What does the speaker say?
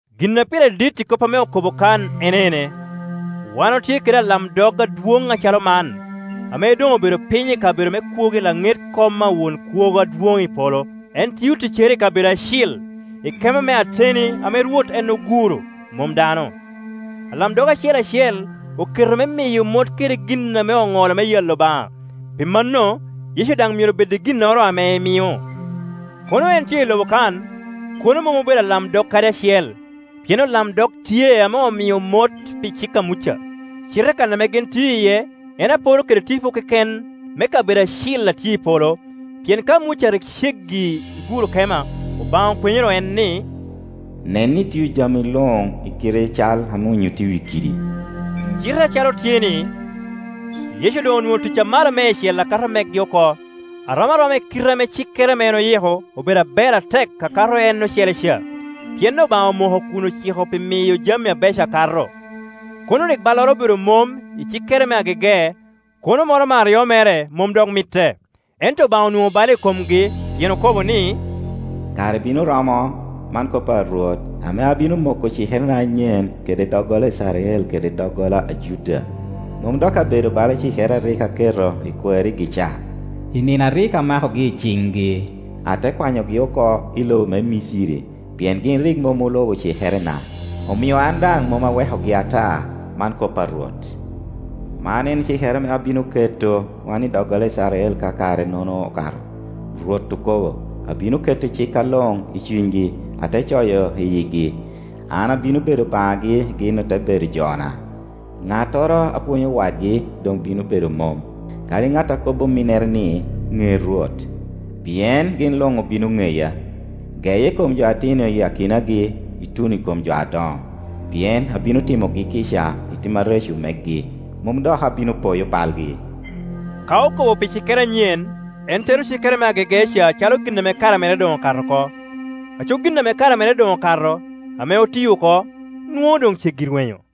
Gin a pire dit i kop ame okobo kan en ene: wan otye kede alamdog adwoŋ acalo man, ame doŋ obedo piny i kabedo me kwogo i laŋet kom a Won Kwogo Adwoŋ i polo. En tio ticcere i kabedo acil, i kema me ateni ame Rwot en oguro, mom dano. Alamdog acel acel oketo me miyo mot kede gin ame oŋolo me yalo Obaŋa; pi mano Yecu daŋ myero bed i ginnoro ame emio. Kono en tye i lobo kan, kono mom obedo alamdog kadi acel, pien olamdog tye ame omio mot pi cik a Muca. Cite kan ame gin tio iye en apor kede tipo keken me kabedo acil a tye i polo; pien ka Muca rik ceggi i guro kema, Obaŋa okwenyoro en ni, “Nen ni itio jami luŋ i kite cal ame onyutti i wi kidi.” Cite acalo tye-ni, Yecu doŋ onwoŋo tic amalo meicel a kato megi oko, a rom aroma i kite ame cikere ame en oyiko obedo aber atek a kato en ocele ca, pien Obaŋa omoko kun ociko pi miyo jami abeco akato. Kono rik balloro obedo mom i cikere me agege, kono moro me aryo mere mom dok mitte. Ento Obaŋa onwoŋo bal i komgi, pien okobo ni, “Kare bino romo, man kop a Rwot, ame abino moko cikerena anyen kede doggola Icrael kede doggola a Juda. Mom dok abedo bala cikere a rik aketo i kwarigi ca, i nino a rik amakogi i ciŋgi, ate kwanyogi oko i lobo me Miciri; pien gin rik mom olubo cikerena, omio an daŋ mom awekogi ata, man kop a Rwot. Man en cikere ame abino keto wan i doggola Icrael ka kare-nono okato, Rwot okobo: Abino keto cikka luŋ i cunygi, ate coyo i yigi. An abino bedo Obaŋagi gin ote bedo jona, Ŋattoro a pwonyo wadgi doŋ bino bedo mom, kadi ŋat a kobbi ominnere ni, ‘Ŋe Rwot’, pien gin luŋ obino ŋeya, geye i kom jo atino i akinagi, ituno i kom jo adoŋo. Pien abino timogi kica i tim areco megi, mom dok abino poyo balgi.” Ka okobo pi cikere anyen, en tero cikere me agege ca acalo gin ame kare mere doŋ okato oko. Aco gin ame kare mere doŋ okato, ame oti oko, nwoŋo doŋ ceggi rwenyo.